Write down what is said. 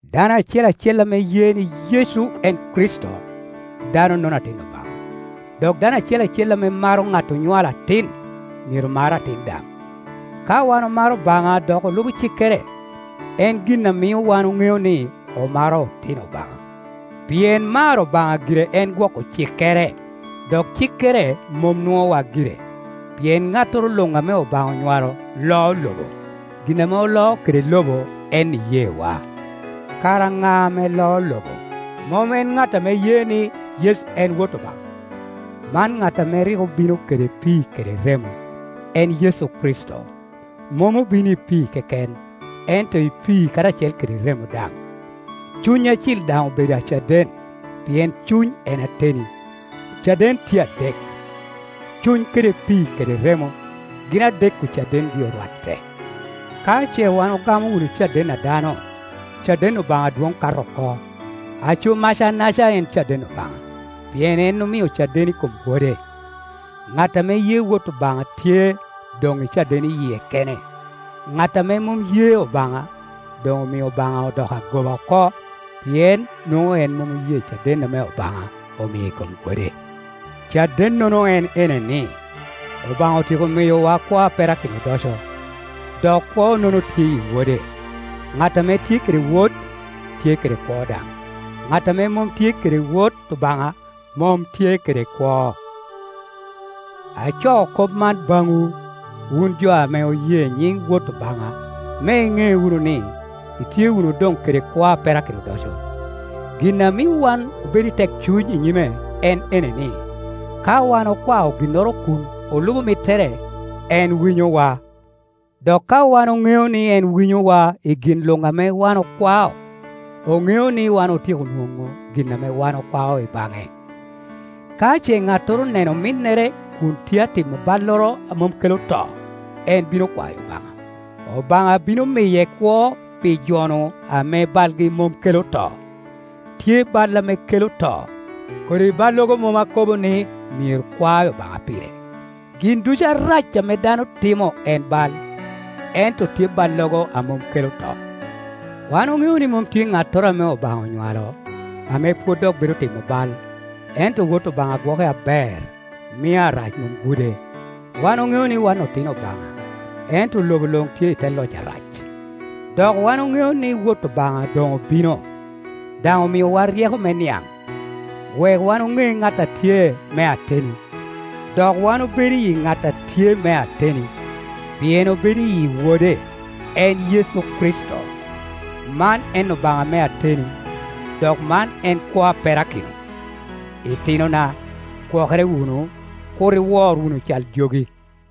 Dano acel acel ame ye ni Yecu en Kricito, dano-nono atin Obaŋa, dok dano acel acel ame maro ŋat onywalo atin, myero mar atin daŋ. Ka wan omaro Obaŋa dok olubo cikkere, en gin a mio wan oŋeo ni omaro otino Obaŋa. Pien maro Obaŋa gire en gwoko cikkere. Dok cikkere mom nuowa gire, pien ŋattoro luŋ ame Obaŋa onywalo loo lobo. Gin ame oloo kede lobo en iyeewa. Kara ŋa ame loo lobo? Mom en ŋat ame ye ni, Yecu en Wot Obaŋa? Man ŋat ame rik obino kede pii kede remo, en Yecu Kricito. Mom obino i pii keken, ento i pii karacel kede remo daŋ. Cuny Acil daŋ obedo acaden, pien Cuny en ateni. Ocaden tye adek: Cuny kede pii kede remo; gin adek-ku cadengi orwatte. Ka ce wan ogamo wunu caden a dano, caden Obaŋa dwoŋ kato oko. Aco macanaca en caden Obaŋa, pien en omio caden i kom Wode. Ŋat ame ye Wot Obaŋa tye doŋ i caden i yie kene. Ŋat ame mom ye Obaŋa doŋ omio Obaŋa odoko agoba oko, pien nwoŋo en mom oye caden ame Obaŋa omio i kom Wode. Cadennono en ene ni, Obaŋa otyeko miyowa kwo a perakino odoco, dok kwo-nono tye i Wode. Ŋat ame tye kede Wod, tye kede kwo daŋ; ŋat ame mom tye kede Wot Obaŋa, mom tye kede kwo. Acoo kop man baŋwu, wun jo ame oye nyiŋ Wot Obaŋa, me iŋe wunu ni, itye wunu doŋ kede kwo a perakino odoco. Gin a mio wan obedo i tekcuny i nyime en ene ni, ka wan okwao ginnoro kun olubo mittere, en winyowa. Dok ka wan oŋeo ni en winyowa i gin luŋ ame wan okwao, oŋeo ni wan otyeko nwoŋo gin ame wan okwao i baŋe. Ka ce ŋattoro oneno ominnere kun tye a timo balloro a mom kelo to, en bino kwayo Obaŋa, Obaŋa bino miye kwo pi jo-nu ame balgi mom kelo to. Tye bal ame kela to; kodi ballogo mom akobo ni myero kwa Obaŋa pire. Gin ducu arac ame dano timo en bal, ento tye ballogo a mom kelo to. Wan oŋeo ni mom tye ŋattoro ame Obaŋa onywalo, ame pwod dok bedo timo bal, ento Wot Obaŋa gwoke aber, mio Arac mom gude. Wan oŋeo ni wan otino Obaŋa, ento lobo luŋ tye i te loc Arac. Dok wan oŋeo ni Wot Obaŋa doŋ obino, daŋ omiowa ryeko me niaŋ, wek wan oŋe ŋat a tye me ateni. Dok wan obedo iyi ŋat a tye me ateni, pien obedo iyi Wode, en Yecu Kricito. Man en Obaŋa me ateni, dok man en kwo a perakino. Itinona, gwokere wunu, kur iwor wunu cal jogi.